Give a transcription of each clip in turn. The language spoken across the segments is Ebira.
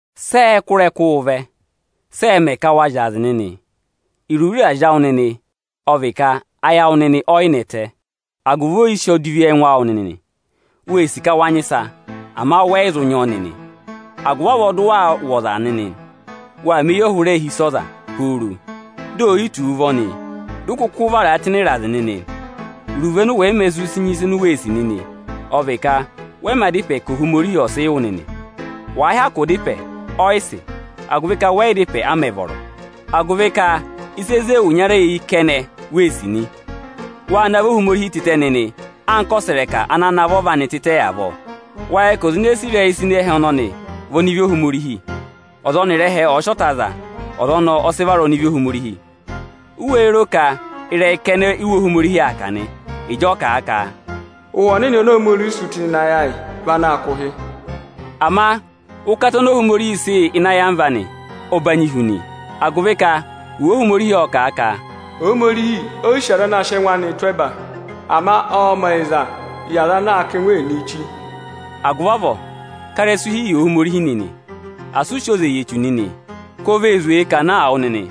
Sị ẹẹ̄ kụ́ ịrẹkụụ vẹ, sị ẹẹ̄ mẹ ka waa zyaazị nịnị? Iruvo ịrazị awụ nịnị ọ vị ka ayị awụ nịnị ọ yị nẹtẹ agụvị oyisì odivi ẹngụ awụ nịnị. Wee sì ka wa nyị ịsa, ama wẹ yị zụ nyị ọ nịnị, agụvị avọọ dị ụ waa wụ́ ọza nịnị nị. Waa mẹ eyọhụrẹ hi ịsa ọza nịnị pooro di ò yi tù wu nịnị ụvọ nị, dị ụ kụkụ vara a ịrazị nịnị. Iruvo ọnị ụ wẹ̀ yị mā zụ sị nyị ịsị u wee sì nịnị, ọ vị ka wẹ yị mā da ịpẹ ka Ohomorihi ọ̀ sị wụ nịnị nị. Wàa hyakụ da ịpẹ, ọ yị sị, agụvị ka wẹ yị da ịpẹ a mẹ̀ vọrọ nịnị; agụvị ka ịsa ene zé ẹwụ ịnyara eyi nịnị kẹnẹ u wee sì nịnị nị. Wâ navọ Ohomorihi tịtẹ nịnị anka ọsẹrẹka ana navọ ọva anị tịtẹ avọọ. Wáá yẹ nịnị ka ọza ene sì ịrẹyị ịsa ịnị ẹhẹ ọnọnị vị ọnịvị Ohomorihi? Ọza ọnịrị ẹhẹ ọ̀ọ sị ọta za, ọza ọnọọ ọ sị vara ọnịvị Ohomorihi. U wéé ro ka ịrẹyị kẹnẹ-kẹnẹ Iwe Ohomorihi aa kà nị, ịjị ọ kà a ka: Ụhwẹ Ọnịnị oni Ohomorihi sị tụ́ ịnị ayị awụ nịnị vị anaā kụ̀ ụhị? Ama ụkata oni Ohomorihi sị yị ọ banyị hu nị, agụvị ka Iwe Ohomorihi ọ́ kà a ka: Ohomorihi o yi sì aza anaā sịị ẹngụ ẹnịnịị̄ tụ́ ẹba ama ọọ̄ mẹ̀ ọyịzaa yị aza anaā kà ẹngụ ẹnịnịị chi. Agụvị avọọ ká ịrẹsụ hi yị Ohomorihi nịnị! Asị ụ sị oze yị Echu nịnị, ka o vee zwèe kà naa wụ nịnị.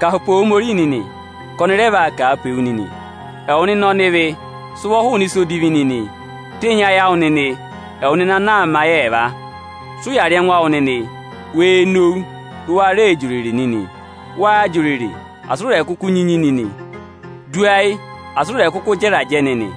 Kà pe Ohomorihi nịnị, ka ọnị rẹ vaa kà a pe wu nịnị! Ẹwụ nịnị ọnịvị, sị ụvọ hụụnị ịsa odivi nịnị! Tenyi ayị awụ nịnị, ẹwụ nịnị ana aa mẹ ayị ẹẹva! Sị ụya rị ẹngụ awụ nịnị, wee nowu dị ụ wa rẹẹ jị òrèrè nịnị. Waa jị òrèrè, asị u re kuku nyi unyi nịnị! Du ayị, asị ụ rẹ kụkụ jẹ ịrajẹ nịnị!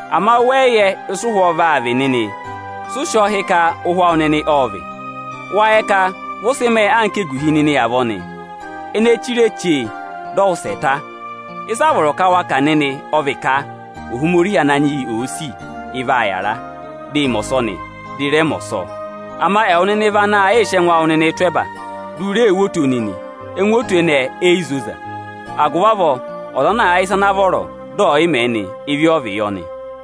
Ama wẹ yị yẹ ịsị ụhwọọ vaa vị nịnị. Sị ụ sị ọ hị́ ka ụhwẹ awụ nịnị ọ́ọ vị? Vị ụ sị mẹẹ nịnị anka eguhi ene èe chire chee, dị ọ wụsẹ ta avọọ nị. Ịsị a vọrọ ka wa kà nịnị, ọ vị ka: Ohomorihi Ananyị yị òo sì, ị vaa yàra, dị ị mẹ ọsọnị, dị ị rẹ mẹ ọsọọ. Ama ẹwụ nịnị vị anaā yị sị ẹngụ awụ nịnịị tụ́ ẹba, di u ree wo oto nịnị. Ẹngụ oto ọnọọ e yi zoza. Agụvị avọọ ọza ana àa yẹ ịsa ana vọrọ dị ẹ̀ yị mẹẹ nị, ịvị ọ vị yọ nị.